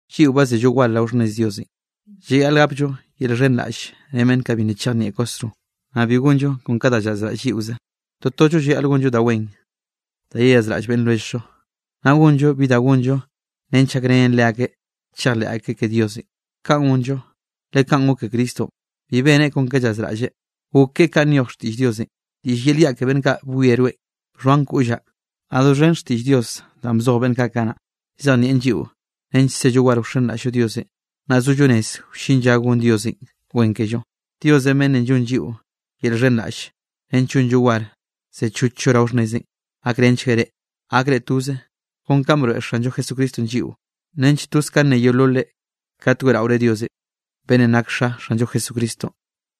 Lliꞌo ba zello war rao xhnnez Diosenꞌ, llayaꞌl gapllo yel xhenraꞌll ren beꞌnn kaꞌ bi nna chejnieꞌ kwasro, naꞌ bi gonllo kon ka da llazraꞌll lliꞌoze. Totollo llayaꞌl gonllo da wen da yeyazraꞌll beꞌnn lwelljllo, naꞌ gonllo bi da gonllo nench gakrenen leakeꞌ chejleꞌ akeꞌ ke Diosenꞌ. Kaꞌn gonllo, le kaꞌn gok ke Cristonꞌ, bi beneꞌ kon ke llazraꞌlleꞌ, gok keꞌe kanꞌ nyoj xtiꞌll Diosenꞌ: “Diꞌll yel yaꞌ ke beꞌnn kaꞌ bwie rweꞌn, bxhoan koꞌllaꞌ.” Naꞌ doxhen xtiꞌll Diosenꞌ danꞌ bzoj beꞌnn kaꞌ kanaꞌ, llzejnieꞌn lliꞌo nench sello war wxenraꞌll-llo Diosenꞌ, naꞌ sollo rez wllin lla gon Diosenꞌ wen kello. Dios beꞌnnenꞌ llonn lliꞌo yel llxhenraꞌll nench llonllo war sechochllo rao xhnnezeꞌn, gakrenchgueꞌ reꞌ, gakre toze kon kanꞌ broeꞌ Xanllo Jesucristonꞌ lliꞌo, nench toze kanꞌ nne yeololre kat weꞌraore Diosenꞌ, beꞌnnenꞌ nak Xa Xanllo Jesucristonꞌ.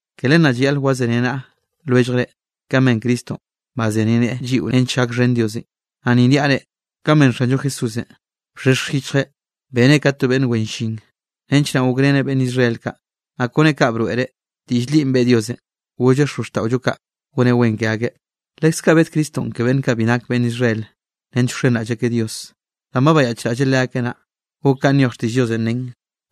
Ke len naꞌ llayaꞌl wazeniaꞌnaꞌa lwelljre, kanꞌ ben Cristonꞌ bazeniaꞌneꞌe lliꞌo nench gakxhen Diosenꞌ. Naꞌ ni niaꞌ reꞌ, kanꞌ ben Xanllo Jesúsenꞌ, bxhexj yichjeꞌ beneꞌ ka to beꞌnn wen llin, nench naꞌ gokreneꞌ beꞌnn Israel kaꞌ, naꞌ kone kaꞌ broeꞌreꞌ, diꞌll linꞌ beꞌe Diosenꞌ, golleꞌ xozxtaꞌollo kaꞌ goneꞌ wen ke akeꞌ. Leskaꞌ bed Cristonꞌ ke beꞌnn kaꞌ bi nak beꞌnn Israel nench wxenraꞌll akeꞌ Dios, danꞌ ba bayaꞌchraꞌlleꞌ leakeꞌ naꞌ, gok kanꞌ nyoj xtiꞌll Diosenꞌ nen: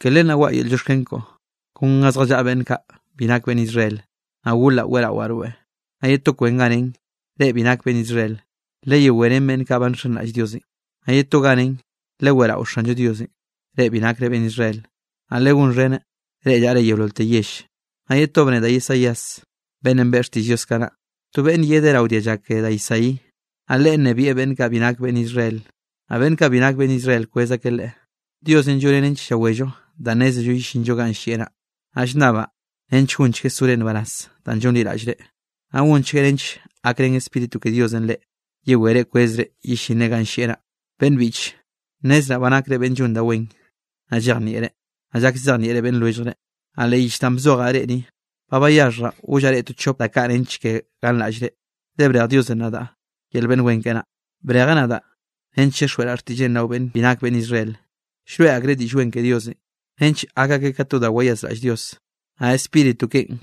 Ke len naꞌ waꞌa yel llioxken koꞌo, kon ga zjallaꞌa beꞌnn kaꞌ bi nak beꞌnn Israel, naꞌ golaꞌ weꞌrawaꞌ rweꞌ. Naꞌ ye to kwen ganꞌ nen: Reꞌ bi nak beꞌnn Israel, leyewé ren beꞌnn kaꞌ ba nxenraꞌll Diosenꞌ. Naꞌ ye to ganꞌ nen: Leweꞌrao Xanllo Dios, reꞌ bi nakre beꞌnn Israel. Naꞌ legonxheneꞌ, reꞌ llaꞌre yeololte yell. Naꞌ ye to bne da Isaías beꞌnnenꞌ beꞌe xtiꞌll Dios kanaꞌ: To beꞌnne yedeꞌ rao dialla ke da Isaí. Naꞌ Leꞌe nnebieꞌ beꞌnn kaꞌ bi nak beꞌnn Israel, naꞌ beꞌnn kaꞌ bi nak beꞌnn Israel kwez akeꞌ Leꞌe. Diosenꞌ lloneꞌ nench llawello danꞌ nnézello yellinllo ganꞌ llieꞌ naꞌ. Naꞌ llnnabaꞌ nench gonchgueꞌ sore nbaraz danꞌ llonliraꞌllreꞌ, naꞌ gonchgueꞌ nench gakrén Spíritu ke Diosenꞌ reꞌ, yewere kwezre yellinre ganꞌ llieꞌ naꞌ. Beꞌnn biꞌche, nnezraꞌ ba nakre beꞌnn llon da wen, naꞌ llejnieꞌre, naꞌ llak llzejnieꞌre beꞌnn lwelljre. Naꞌ leꞌ yich danꞌ bzojaꞌ reꞌ ni, ba bayaxhjraꞌ gollaꞌ reꞌ to chop da kaꞌ nench ke ganraꞌllre, le brej Diosenꞌ nadaꞌ yel beꞌnn wen keꞌe naꞌ. Brejeꞌ nadaꞌ nench chixjweꞌraꞌ xtiꞌlleꞌn rao beꞌnn bi nak beꞌnn Israel. Llroeꞌ akreꞌ Diꞌll Wen ke Diosenꞌ nench gak akeꞌ ka to da wayazraꞌll Dios. Naꞌ Spíritu keꞌen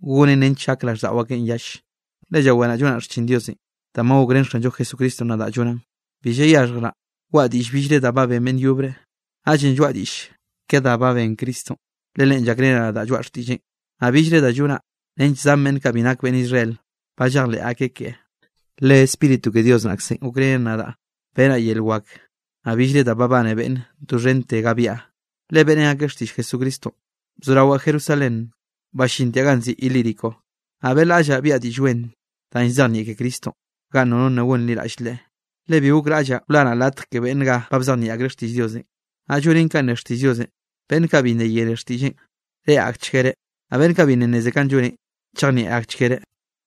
gonen nench gak raꞌlldaꞌo akeꞌn yall. Le llaweraꞌ llonaꞌ xchin Diosenꞌ danꞌ ba gokrén Xanllo Jesucristonꞌ nadaꞌ llonaꞌn. Bi llayaxhjraꞌ waꞌa diꞌll billre da ba ben beꞌnn yobre, naꞌllenꞌ lloaꞌa diꞌll ke da ba ben Cristonꞌ, le Leꞌen llakreneꞌ nadaꞌ lloaꞌa xtiꞌlleꞌn, naꞌ billre da llonaꞌ nench zan beꞌnn kaꞌ bi nak beꞌnn Israel ba llejleꞌ akeꞌ keꞌe. Le Spíritu ke Dios naꞌkzenꞌ gokrenen nadaꞌ benaꞌ yel wak, naꞌ billre da babane beꞌnne doxhente ga byaꞌa, le beꞌrén akeꞌ xtiꞌll Jesucristonꞌ, bzorawaꞌ Jerusalén ballintiaꞌ ganꞌ nziꞌi Ilírico. Naꞌ beꞌlaꞌllaꞌ biaꞌa Diꞌll Wen danꞌ llzejnieꞌ ke Cristonꞌ ganꞌ nono nna gonliraꞌll Leꞌe, le bi gokraꞌllaꞌ wlanaꞌ latj ke beꞌnn ga ba llzejnieꞌ akreꞌ xtiꞌll Diosenꞌ. Naꞌ llonen kanꞌ ne xtiꞌll Diosenꞌ: Beꞌnn kaꞌ bi nna yene xtiꞌlleꞌn, reꞌe akchguereꞌ, naꞌ beꞌnn kaꞌ bi nna nneze kanꞌ lloneꞌn, chejnieꞌ akchguereꞌ.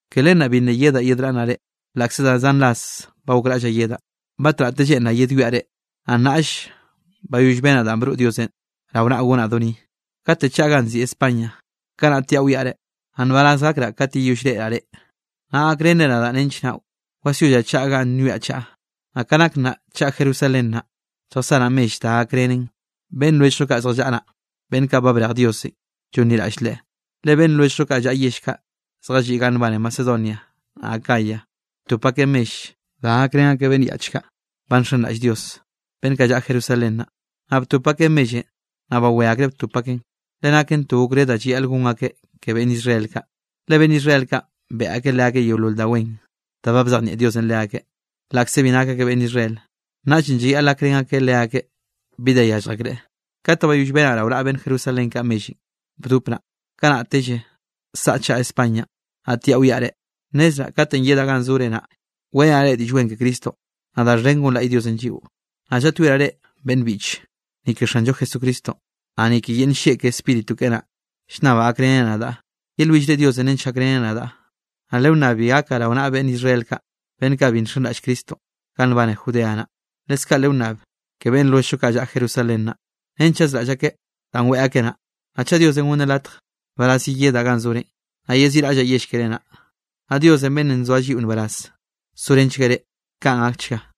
Ke len naꞌ bi nna yedaꞌ yedraꞌnnaꞌ reꞌ, laꞌkze da zan ras ba gokraꞌllaꞌ yedaꞌ. Batnaꞌte lleꞌnraꞌ yedwiaꞌ reꞌ, naꞌ nnaꞌll bayoll benaꞌ danꞌ broꞌ Diosenꞌ rao naꞌ gonaꞌ do ni. Kate chaꞌa ganꞌ nziꞌi España, kanaꞌ tiaꞌ wiaꞌ reꞌ. Naꞌ nbaraz gakraꞌ kat yeyoll reꞌraꞌ reꞌ, naꞌ gakrenre nadaꞌ nench naꞌ wasyollaꞌ chaꞌa ganꞌ ba nwiaꞌ chaꞌa. Naꞌ ka nak nnaꞌ chaꞌa Jerusalén naꞌ, lljasanaꞌ mell da gakrenen beꞌnn lwelljllo kaꞌ zjallaꞌa naꞌ, beꞌnn kaꞌ ba brej Diosenꞌ llonliraꞌll Leꞌe. Le beꞌnn lwelljllo kaꞌ llaꞌa yell kaꞌ zjalliꞌ ganꞌ nbane Macedonianꞌ, naꞌ Acaya, btop akeꞌ mell da gakrén akeꞌ beꞌnn yaꞌch kaꞌ ba nxenraꞌll Dios, beꞌnn kaꞌ llaꞌa Jerusalén naꞌ. Naꞌ btop akeꞌ mellenꞌ, naꞌ bawé akreꞌ btop akeꞌn, le naken to okré da llayaꞌl gon akeꞌ ke beꞌnn Israel kaꞌ. Le beꞌnn Israel kaꞌn beꞌe akeꞌ leakeꞌ yeolol da wen da ba bzejnieꞌ Dios leakeꞌ, laꞌkze bi nak akeꞌ beꞌnn Israel, naꞌllenꞌ llayaꞌl gakrén akeꞌ leakeꞌ bi da yallj akreꞌ. Kat ba bayoll benaꞌ rao naꞌa beꞌnn Jerusalén kaꞌ mellenꞌ bdop naꞌ, kanaꞌtelle saꞌa chaꞌa Españanꞌ, naꞌ tiaꞌ wiaꞌ reꞌ. Nnezraꞌ katenꞌ yedaꞌ ganꞌ zore naꞌ, weꞌrenaꞌ reꞌ Diꞌll Wen ke Cristonꞌ, naꞌ da xhen gonlaꞌy Diosenꞌ lliꞌo. Naꞌ llaꞌtyoeraꞌ reꞌ, beꞌnn biꞌche, ni ke Xanllo Jesucristonꞌ, naꞌ ni ke yel nllieꞌ ke Spíritu keꞌe naꞌ, llnnabaꞌ gakrenre nadaꞌ, yelwillre Diosenꞌ nench gakreneꞌ nadaꞌ. Naꞌ lewnnab bi gakaꞌ rao naꞌa beꞌnn Israel kaꞌ, beꞌnn kaꞌ bi nxenraꞌll Cristo ganꞌ nbane Judea naꞌ, leskaꞌ lewnnab ke beꞌnn lwelljllo kaꞌ llaꞌa Jerusalén naꞌ, nench chazraꞌll akeꞌ danꞌ weꞌe akeꞌ naꞌ. Naꞌ chaꞌ Diosenꞌ gonneꞌ latj, nbaraz yeyedaꞌ ganꞌ zorenꞌ, naꞌ yeziꞌraꞌllaꞌ yell keré naꞌ. Naꞌ Dios beꞌnnenꞌ nzoa lliꞌo nbaraz sorenchgueꞌ reꞌ. Kaꞌn gakchga.